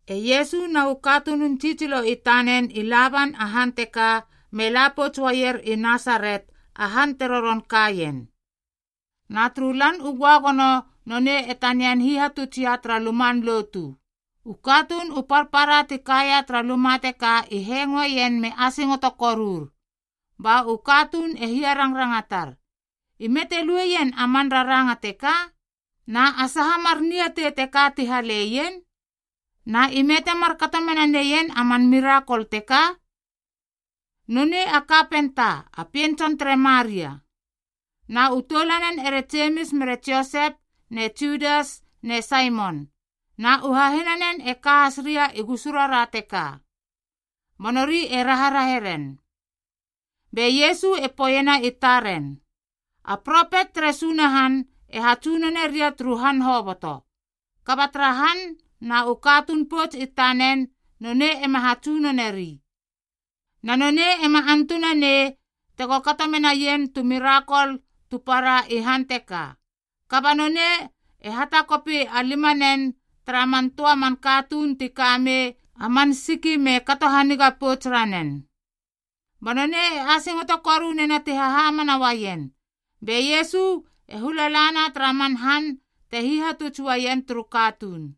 E Iesu na u katunun tsitsilo i tanen i la ban a han teka me la pouts uaier i Nasaret a han te roron kaien. Na turu Lan u Göagono nonei e tanian hihatutsia tara luman lotu. U katuun u parpara ti kaia tara luma teka i hengoeien me asingoto korur. Ba u katuun e hiarangrangatar, “Ime te lueien a man raranga teka? Na a saha mar niatei teka ti haleien? Na ime te markato mena neien a man mirakol teka? Nonei a kapenta, a pien tson tere Maria. Na u toulanen ere Jemis mere Josep ne Judas ne Saimon, na u hahinanen e ka has ria i gusu rara teka.” Ba nori e raharahe ren. Be Iesu e poeiena i taren, “A propet tere Sunahan e hatsunone ria turu han hoboto. Kaba tara han na u katuun pouts i tanen, nonei ema hatsunoneri.” Na nonei ema antunanei tego kato menaien tu mirakol tu para i han teka, kaba nonei e hatakopi a limanen tara man töa man katuun ti ka mei a man siki me kato haniga pouts ranen. Ba nonei e asingoto koru nena ti hahamana uaien. Be Iesu e hula la na tara man han te hihatuts uaien turu katuun.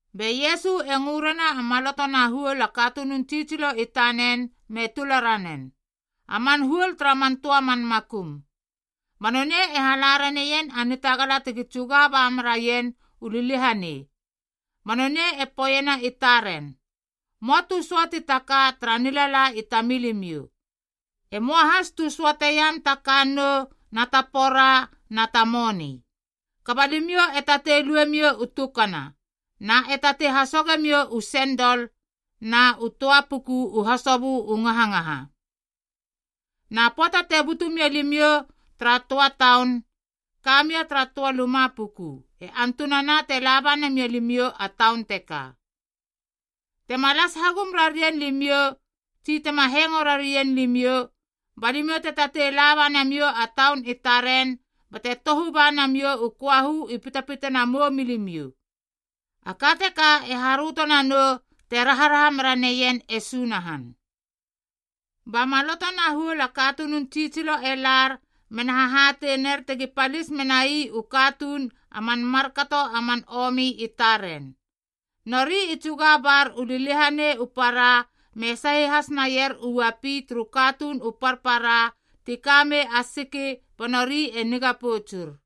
Be Iesu e ngö rena a maloto na huol a katunun tsitsilo i tanen me tula ranen, a man huol tara man töa man makum. Ba nonei e hala raneien a nitagala tegi tsuga ba meraien u liliahanei. Ba nonei e poeiena i taren, “Möa tu söati ta ka tara nilala i tamilimiou. E möa has tu söateiam ta kannou na ta pora na ta moni. Kaba limiou e tatei luemiou u tukana, na e tatei hasogemiou u sendol na u töa puku u hasobö u ngahangaha. Na pöata te butu mia limiou tara töa taun, ka mia tara töa luma puku e antunana te laba namia limiou a taun teka. Tema las hagum rarien limiou tsi tema hengo rarien limiou, ba limiou te tatei laba namiou a taun i taren bate tohu ba namiou u köahu i pitpitana moumilimiou. A ka teka e haröto nanou te raharaha mera neien e Sunahan.” Ba maloto na huol a katunun tsitsilo e lar mena hahatei ner tegi palis menai u katuun a man markato a man omi i taren. Nori i tsuga bar u liliahanei u para me sahi has naier u uapi turu katuun u parpara ti kamei a siki ba nori e niga poutsur.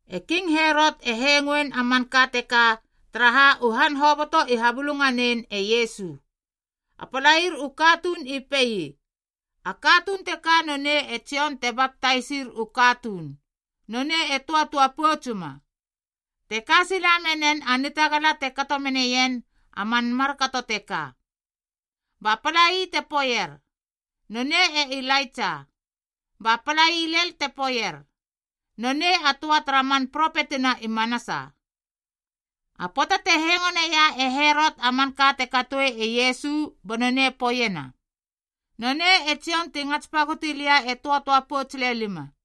E King Herot e hengoein a manka teka, taraha u han hoboto i habulunganein e Iesu. A palair u katuun i pei, “A katuun teka nonei e Jon te baptaisir u katuun, nonei e töatöa poutsuma, te ka sila menen a nitagala te kato meneien a man markato teka.” Ba palai te poeier, “Nonei e Ilaitsa.” Ba palai lel te poeier, “Nonei a töa tara man propetina i manasa.” A pöata te hengoneia e Herot a manka te katoe e Iesu ba nonei e poeiena, “Nonei e Jon ti ngats pagoti lia e töatöa pouts lelima.”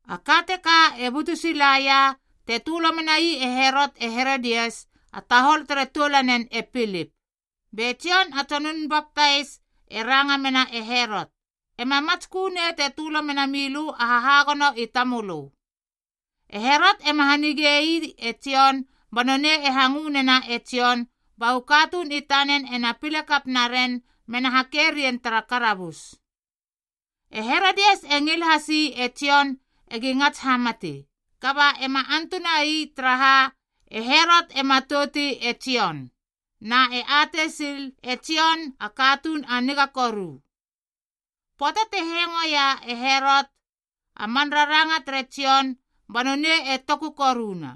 A ka teka e butu silaia te tölo menai e Herot e Herodias a tahol tere toulanen e Pilip. Be Jon a tsonun baptais e ranga mena e Herot, “Ema matskö nei te tölo mena milö a hahagono i tamölö.” E Herot ema hanigei e Jon ba nonei e hangö nena e Jon ba u katuun i tanen ena pile kap naren mena hake rien tara karabus. E Herodias e ngil hasi e Jon egi ngats hamati, kaba ema antuna ii taraha, e Herot e matouti e Jon, na e atei sil e Jon a katuun a niga koru. Pöata te hengoeia e Herot a man raranga tere Jon ba nonei e toku koruna,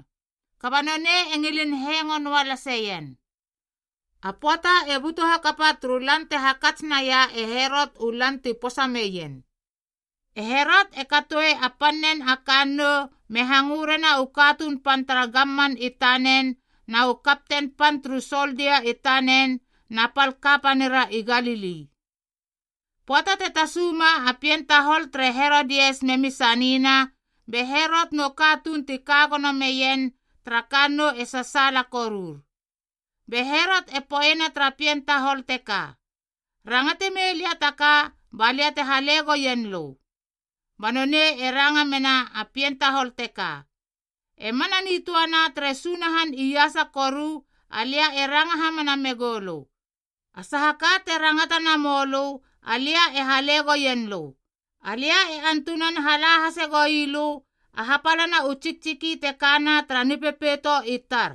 kaba nonei e ngilin hengo noa laseien. A pöata e butu hakapa turu lan te hakats naia e Herot u lan ti posa meien. E Herot e katoe a pannen a kannou me hangö rena u katuun pan tara gamman i tanen na u kapten pan turu soldia i tanen na pal kapanira i Galili. Pöata te tasuma a pien tahol tere Herodias memi sanina, be Herot nu katuun ti ka gono meien tara kannou e sasaala korur. Be Herot e poeiena tara pien tahol teka, “Rangate mei lia ta ka ba lia te hale goien lö.” Ba nonei e ranga mena a pien tahol teka, “E mana nitöana tere Sunahan iasa koru alia e ranga hamana megou lö, a saha ka te rangata namou lö alia e hale goien lö, alia e antunan hala hase goilö a hapalana u tsiktsiki te kana tara nipepeito i tar!”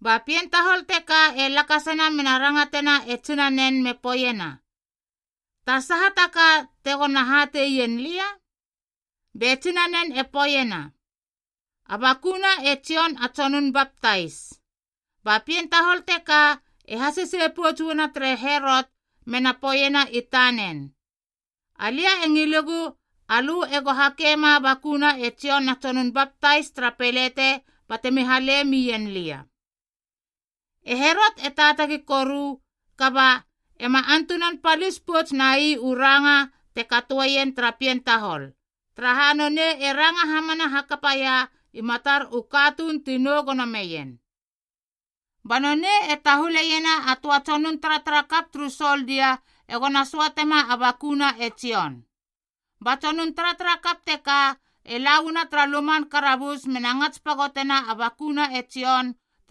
Ba pien tahol teka e lakasana mena rangatena e tsinanen me poeiena, “Ta saha taka tegona hateien lia?” Be tsinanen e poeiena, “A bakuna e Jon a tsonun baptais!” Ba pien tahol teka e hasesei pouts uana tere Herot mena poeiena i tanen, “Alia e ngilegu alö ego hakema a bakuna e Jon a Tsonun Baptais tara pelete batemi hale mien lia.” E Herot e taatagi koru, kaba ema antunan palis pouts nai u ranga te katoeien tara pien tahol, taraha nonei e ranga hamana hakapaia i matar u katuun ti nou gono meien. Ba nonei e tahuleiena a töa tsonun taratarakap turu soldia egona söatema a bakuna e Jon. Ba tsonun taratarakap teka e lauana tara luman karabus mena ngats pagotena a bakuna e Jon.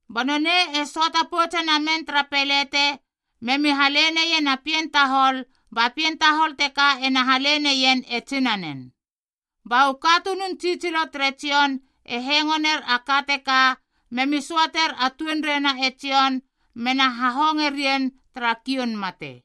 Ba nonei e söata poutse namen tara pelete memi hale neien a pien tahol ba pien tahol teka ena hale neien e tsinanen. Ba u katunun tsitsilo tere Jon e hengo ner a ka teka memi söater a tuenreina e Jon mena hahonge rien tara kioun mate.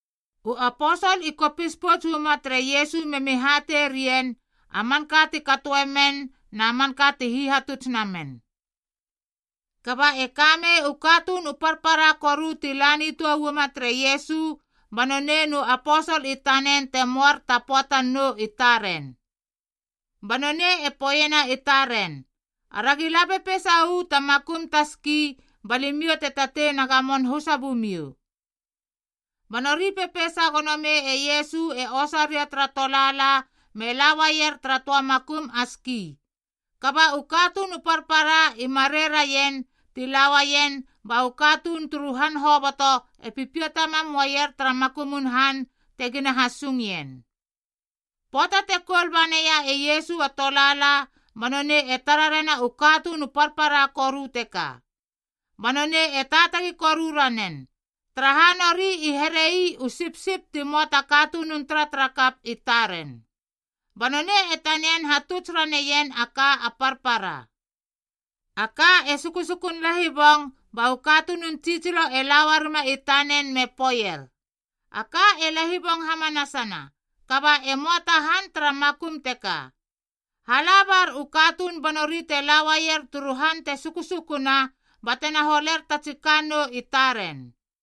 U aposol i kopis pouts uama tere Iesu memi hatei rien a manka ti katoe men na manka ti hihatuts namen. Kaba e kamei u katuun u parpara koru ti la nitöa uama tere Iesu ba nonei nu aposol i tanen te möar ta pöatan nou i taren. Ba nonei e poeiena i taren, “Aragi la pepeisa uu ta makum ta ski ba limiou te tatei na gamon husa bumiou.” Ba nori pepeisa gono mei e Iesu e osa ria tara tolaala me la uaier tara töa makum a ski. Kaba u katuun u parpara i marei raien ti la uaien, ba u katuun turu han hoboto e pipiata mam uaier tara makumun han tegina hasungien. Pöata te koul banaia e Iesu a tolaala ba nonei e tara rena u katuun u parpara koru teka. Ba nonei e taatagi koru ranen, taraha nori i here ii u sipsip ti möa ta katunun taratarakap i taren. Ba nonei e tanian hatuts raneien a ka a parpara. A ka e sukusukun lahibong ba u katunun tsitsilo e la uarima i tanen me poeier, “A ka e lahibong hamanasana kaba e möa ta han tara makum teka. Hala bar u katuun ba nori te la uaier turu han te sukusukuna ba tena holer ta tsi kannou i taren.”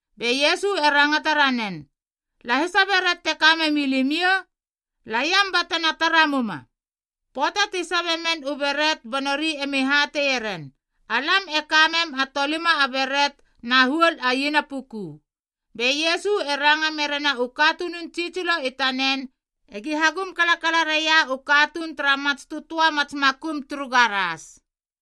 Be Iesu e rangata ranen, “Lahisa beret te ka memi limiou? Laiam batena tara muma.” Pöata ti sabe men u beret ba nori emi hateie ren, “Alam e kamem a tolima a beret na huol a iena puku.” Be Iesu e ranga merena u katunun tsitsilo i tanen egi hagum kalakala raia u katuun tara mats tötöa mats makum turu garas.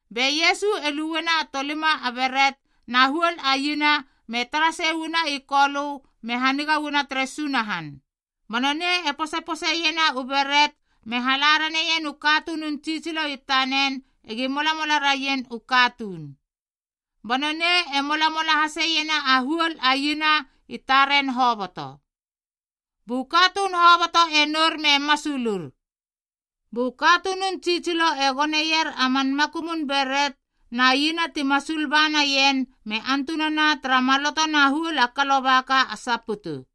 Be Iesu e luena a tolima a beret na huol a iena me tara sei uana i Kolö me haniga uana tere Sunahan. Ba nonei e posepose iena u beret me hala ranei ien u katunun tsitsilo i tanen egi molamola raien u katuun. Ba nonei e molamola haseiena a huol a iena i taren hoboto. Bu katuun hoboto e nour me masulur. Bu katunun tsitsilo e goneier a man makumun beret na iena ti masul ba naien me antunana tara maloto na huol a kalobaka a saputu.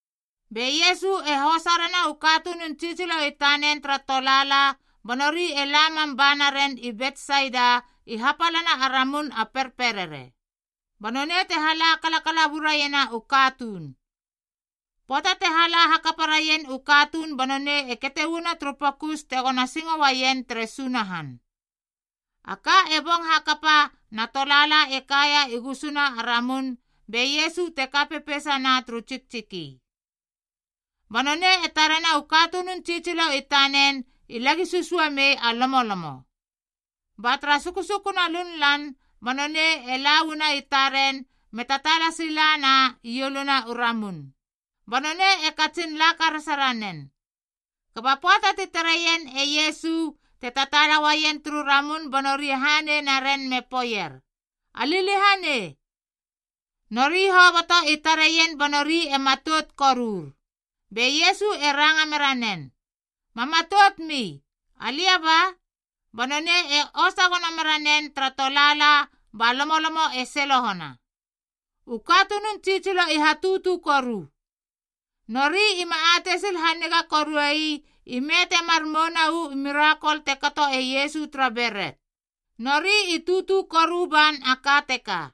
Be Iesu e hosa rena u katunun tsitsilo i tanen tara tolaala ba nori e la mam banaren i Betsaida i hapalana a ramun a perperere. Ba nonei te hala kalakala buraiena u katuun. Pöata te hala hakapa raien u katuun ba nonei e kete uana turu pokus tegona singo uaien tere Sunahan. A ka e bong hakapa na tolaala e kaia i gusuna a ramun be Iesu te ka pepeisana turu tsiktsiki. Ba nonei e tarena u katunun tsitsilo i tanen i lagi susua mei a lomolomo. Ba tara sukusukuna lunlan ba nonei e la uana i taren me tataala silana i ieluna u ramun. Ba nonei e katsin la karasa ranen. Kaba pöata ti tareien e Iesu te tataala uaien turu ramun ba nori e hanei naren me poeier, “A liliahanei!” Nori hoboto i tareien ba nori e matout korur. Be Iesu e ranga mera nen, “Ma matoutmi. Alia ba.” Ba nonei e osa gono mera nen tara tolaala ba lomolomo e selohona. U katunun tsitsilo i hatutu koru. Nori ima atei sil haniga koruei ime temar mouna uu mirakol te kato e Iesu tara beret. Nori i tutu koru ban a ka teka.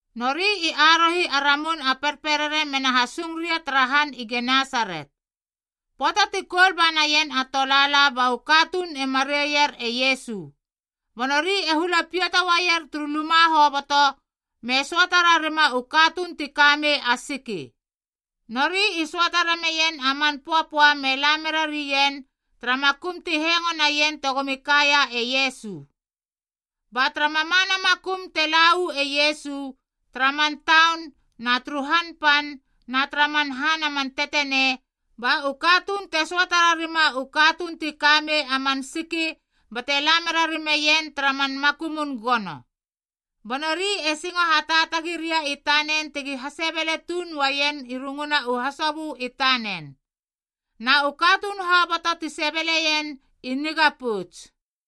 Nori i arohi a ramun a perperere mena hasung ria tara han i Genesaret. Pöata ti koul ba naien a tolaala ba u katuun e mareier e Iesu. Ba nori e hula piata uaier turu luma hoboto me söata rarima u katuun ti ka mei a siki. Nori i söata rameien a man pöapöa me la mera rien tara makum ti hengo naien tegomi kaia e Iesu. Ba tara mamana makum te la uu e Iesu, tara man taun na turu han pan na tara man han a man tetenei, ba u katuun te söata rarima u katuun ti ka mei a man siki bate la mera rimeien tara man makumun gono. Ba nori e singo hataatagi ria i tanen tegi hasebele tuun uaien i runguna u hasobö i tanen. Na u katuun hoboto ti sebeleien i niga pouts.